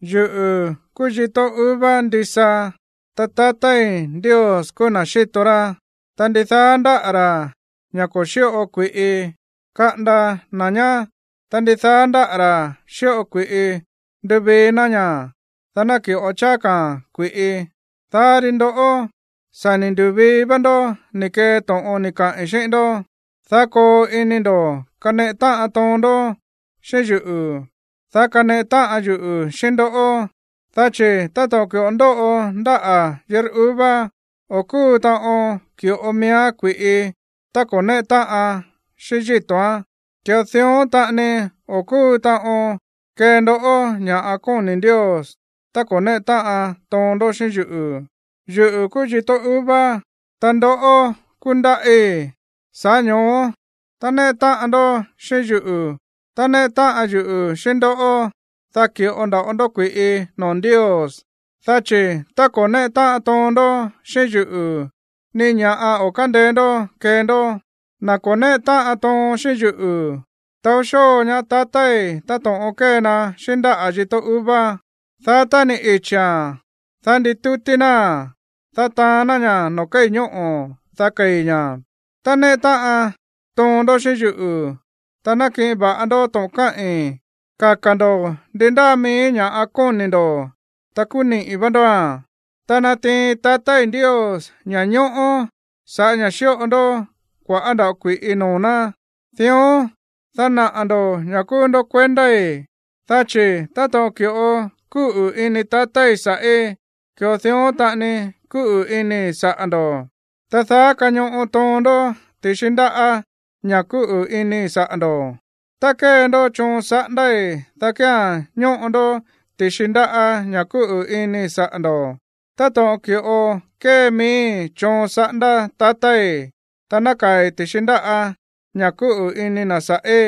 ’Yuꞌu̱ kúú yitó uva ndisa, ta tatái̱ Ndios kúú na̱ xíto rá. Ta ndidaá ndáꞌa̱ ra̱, ña̱ ko̱ xíꞌo kui̱ꞌi, kaꞌanda na̱ ñá. Ta ndidaá ndáꞌa̱ ra̱ xíꞌo kui̱ꞌi, nduvii ná ña̱, dá ná ki̱ꞌo cháá ka̱a̱n kui̱ꞌi. Dá ri ndoꞌó, sa̱ ni̱ ndu̱vii vá ndó ni̱ kee to̱ꞌon ni̱ kaꞌi̱n xíꞌín ndó. Daá koo ini ndo̱ kaneꞌe táꞌan toon ndó xíꞌín yuꞌu̱, dá kaneꞌe táꞌan yuꞌu̱ xíꞌín ndoꞌó. Dá chi̱ táto̱ꞌon ki̱ꞌo ndóꞌo ndáꞌa̱ yitó uva, o̱ kúu taꞌon ki̱ꞌo miíán kui̱ꞌi tá ko̱ néꞌe táꞌan xíꞌín yíto̱án, ki̱ꞌo dión taꞌani o̱ kúu taꞌon kee ndó ña̱ kóni̱ Ndios tá ko̱ néꞌe táꞌan toon ndó xíꞌín yuꞌu̱. ’Yuꞌu̱ kúú yitó uva, ta ndoꞌó kúú ndáꞌí. Sa̱ꞌá ño̱ó tá néꞌe táꞌan toon ndó xíꞌín yuꞌu̱, ta néꞌe táꞌan yuꞌu̱ xíꞌín ndó, dá ki̱ꞌo nda̱ꞌo ndó kui̱ꞌi noo̱ Ndios. Dá chi̱ tá ko̱ néꞌe táꞌan toon ndó xíꞌín yuꞌu̱, ni ña̱ꞌa o̱ kándeé ndó kee ndó. Na̱ ko̱ néꞌe táꞌan toon xíꞌín yuꞌu̱, taó xóo ñaá tatái̱ táto̱ꞌon kée na xíꞌín ndáꞌa̱ yitó uva, dá tá ni̱ ichi̱a̱n, dá nditútí náa̱n, dá taán ná ña̱ noo̱ kéi̱ ñóꞌo̱, dá kei̱ ña̱. ’Tá néꞌe táꞌan toon ndó xíꞌín yuꞌu̱, ta nákiꞌin va̱ꞌa ndó to̱ꞌon káꞌi̱n, kaka̱ ndo̱ ndi ndáa mií ña̱ꞌa kóni̱ ndo̱, ta kúú niꞌi̱ vá ndóa̱n. Ta natiin tatái̱ Ndios ña̱ñóꞌó sa̱ꞌá ña̱ xíꞌo ndó kua̱ꞌá nda̱ꞌo kui̱ꞌi noo̱ ná, dión, dá naꞌa̱ ndo̱ ña̱ kúú ndó kuendái̱. Dá chi̱ táto̱ꞌon ki̱ꞌo kúꞌu̱ ini tatái̱ sa̱ꞌí, ki̱ꞌo dión taꞌani kúꞌu̱ inii̱ saꞌa̱ ndo̱. Ta daá kañoꞌo toon ndó ti̱xi ndáꞌa̱ ña̱ kúꞌu̱ inii̱ saꞌa̱ ndo̱. Tá kée ndó choon saꞌándái̱, dá kía̱n ñóꞌo ndó ti̱xi ndáꞌa̱ ña̱ kúꞌu̱ inii̱ saꞌa̱ ndo̱, táto̱ꞌon ki̱ꞌo kée miíi̱ choon saꞌándá tatái̱, ta nákaa̱i̱ ti̱xi ndáꞌa̱ ña̱ kúꞌu̱ ini na̱ sa̱ꞌí.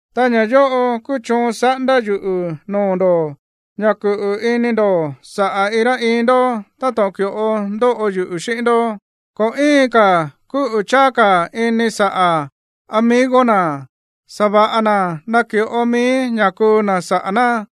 Ta ña̱ yóꞌo kúú choon saꞌándá yuꞌu̱ noo̱ ndo̱, ña̱ kuꞌu̱ ini ndo̱ saꞌa̱ iin rá iin ndó táto̱ꞌon ki̱ꞌo ndóꞌo yuꞌu̱ xíꞌín ndó. Ko̱ íin ka̱ kúꞌu̱ cháá ka̱ ini saꞌa̱ amigo na̱, sa̱va̱ꞌa na̱ naki̱ꞌo mií ña̱ kuu na̱ saꞌa̱ ná.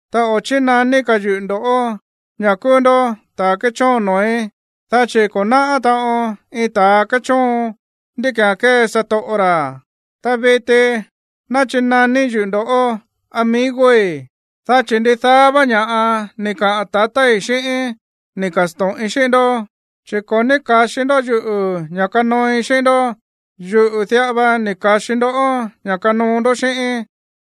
Ta o̱ chínaní ka̱ yuꞌu̱ ndo̱ꞌó ña̱ kúú ndó ta̱ kéchóon noo̱í, dá chi̱ ko̱ náꞌá taꞌon iin ta̱ kéchóon ndí ki̱án kée satoꞌo ra̱. Ta viti nachinaní yuꞌu̱ ndoꞌó amigoi̱, dá chi̱ ndidaá vá ña̱ꞌa ni̱ kaꞌa̱n tatái̱ xíꞌíín ni̱ ka̱sto̱ꞌin xíꞌín ndó. Chi̱ ko̱ ní ka̱xi ndó yuꞌu̱ ña̱ kanooi xíꞌín ndó, yuꞌu̱ diꞌa va ni̱ ka̱xi ndoꞌó ña̱ kanoo ndó xíꞌíín,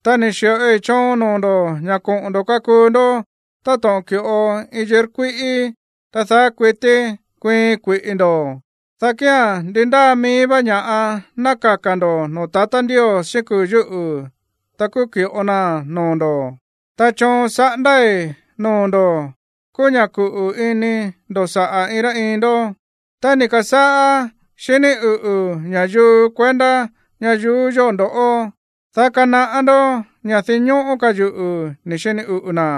ta ni̱ xi̱ꞌoi choon noo̱ ndo̱ ña̱ koꞌo̱n ndo̱ kakuu ndó táto̱ꞌon ki̱ꞌo iin yitó kuíꞌí, ta daá kuití kuiin kui̱ꞌi ndo̱, dá kía̱n ndi ndáa mií vá ña̱ꞌa ná kaka̱ ndo̱ noo̱ tatá Ndios xíꞌín kuu̱ yúꞌu̱, ta kúú ki̱ꞌo naa̱n noo̱ ndo̱. Ta choon saꞌándái̱ noo̱ ndo̱ kúú ña̱ kuꞌu̱ ini ndo̱ saꞌa̱ iin rá iin ndó. ’Tá ni̱ ka̱sáꞌá xiní uꞌu̱ ña̱yuu kuendá ñayuú yóꞌo ndoꞌó, dá kanaꞌá ndó ña̱ dinñóꞌó ka̱ yuꞌu̱ ni̱ xini uꞌu̱ na̱.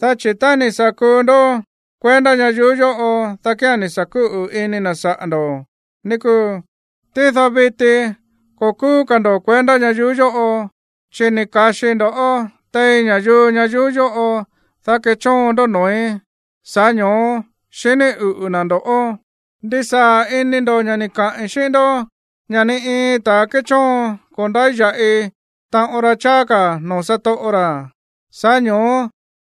Dá chi̱ tá ni̱ sa̱ kuu ndó kuendá ñayuú yóꞌo, dá kía̱n ni̱ sa̱ kuꞌu̱ ini na̱ saꞌa̱ ndo̱, ní kúu. Tído viti ko̱ kúú ka̱ ndo̱ kuendá ñayuú yóꞌo, chi̱ ni̱ ka̱xii ndo̱ꞌó tein ña̱yuu ñayuú yóꞌo, dá kechóon ndó noo̱í, sa̱ꞌá ño̱ó xiní uꞌu̱ na̱ ndo̱ꞌó. Ndisaa̱ ini ndo̱ ña̱ ni̱ kaꞌi̱n xíꞌín ndó ña̱ ni iin ta̱ kéchóon ko̱ ndáya̱ꞌi taꞌon ra cháá ka̱ noo̱ satoꞌo ra̱. Sa̱ꞌá ño̱ó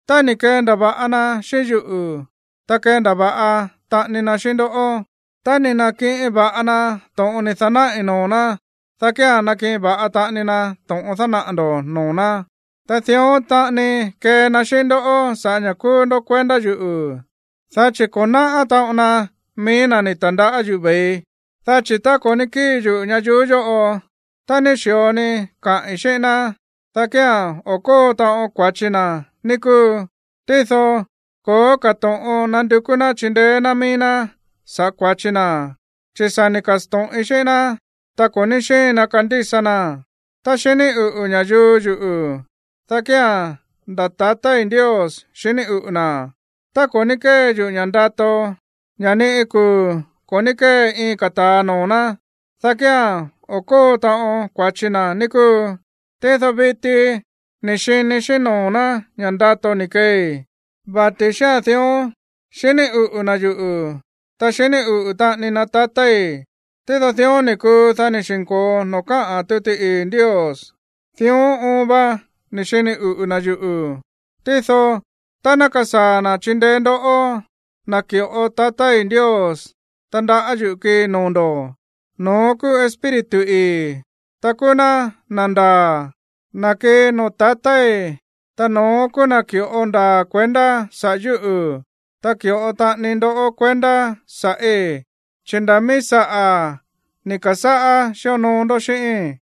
tá ni̱ kendava̱ꞌa na xíꞌín yuꞌu̱, ta kendava̱ꞌa taꞌani na xíꞌín ndó. Tá ni̱ na̱kiꞌin va̱ꞌa na to̱ꞌon ni̱ da̱náꞌi̱ noo̱ ná, dá kía̱n nakiꞌin va̱ꞌa taꞌani na to̱ꞌon dánaꞌa̱ ndo̱ꞌó noo̱ ná. Ta dión taꞌani kee na xíꞌín ndó sa̱ꞌá ña̱ kúú ndó kuendá yuꞌu̱, dá chi̱ ko̱ náꞌá taꞌon na mií na̱ ni̱ ta̱ndaꞌá yuꞌu̱ ve̱ii. ’Dá chi̱ tá ko̱ ní kíi yuꞌu̱ ñayuú yóꞌo, ta ni xi̱o ni̱ kaꞌi̱n xíꞌín ná, dá kía̱n o̱ kóo taꞌon kua̱chi na, ní kúu. Tído ko̱ó ka̱ to̱ꞌon nandukú ná chindeé ná mií ná saꞌa̱ kua̱chi na, chi̱ sa̱ ni̱ ka̱sto̱ꞌin xíꞌín ná, ta ko̱ ní xíin na kandísa naa̱n. Tá xiní uꞌu̱ ña̱yuu yuꞌu̱, dá kía̱n nda̱ tatái̱ Ndios xiní uꞌu̱ na̱. Tá ko̱ ní kée yuꞌu̱ ña̱ ndato, ña̱ ni iin kuu̱ ko̱ ní kée iin ka̱ ta̱a noo̱ ná, dá kía̱n o̱ kóo taꞌon kua̱chi na, ní kúu. Tído viti ni̱ xini xíꞌín noo̱ ná ña̱ ndato ni̱ keei, vati̱ xía̱n dión, xiní uꞌu̱ na̱ yuꞌu̱, ta xiní uꞌu̱ taꞌani na tatái̱. Tído dión ni̱ kuu, dá ni̱ xi̱nko̱o noo̱ káꞌa̱n tuti ii̱ Ndios: “Dión oon va ni̱ xini uꞌu̱ na̱ yuꞌu̱.” ’Tído tá ná kasaa̱ na̱ chindeé ndoꞌó, na̱ ki̱ꞌo tatá Ndios tandaꞌá yuꞌu̱ kii noo̱ ndo̱, no̱ón kúú Espíritu ii̱, ta kúú ná na̱ ndaa̱, na̱ kii noo̱ tatái̱, ta no̱ón kúú na̱ ki̱ꞌo ndaa̱ kuendá saꞌa̱ yúꞌu̱. Ta ki̱ꞌo taꞌani ndó kuendá sa̱ꞌí, dá chi̱ nda̱ mií saꞌa̱ ni̱ ka̱sáꞌá xíonoo ndó xíꞌíín.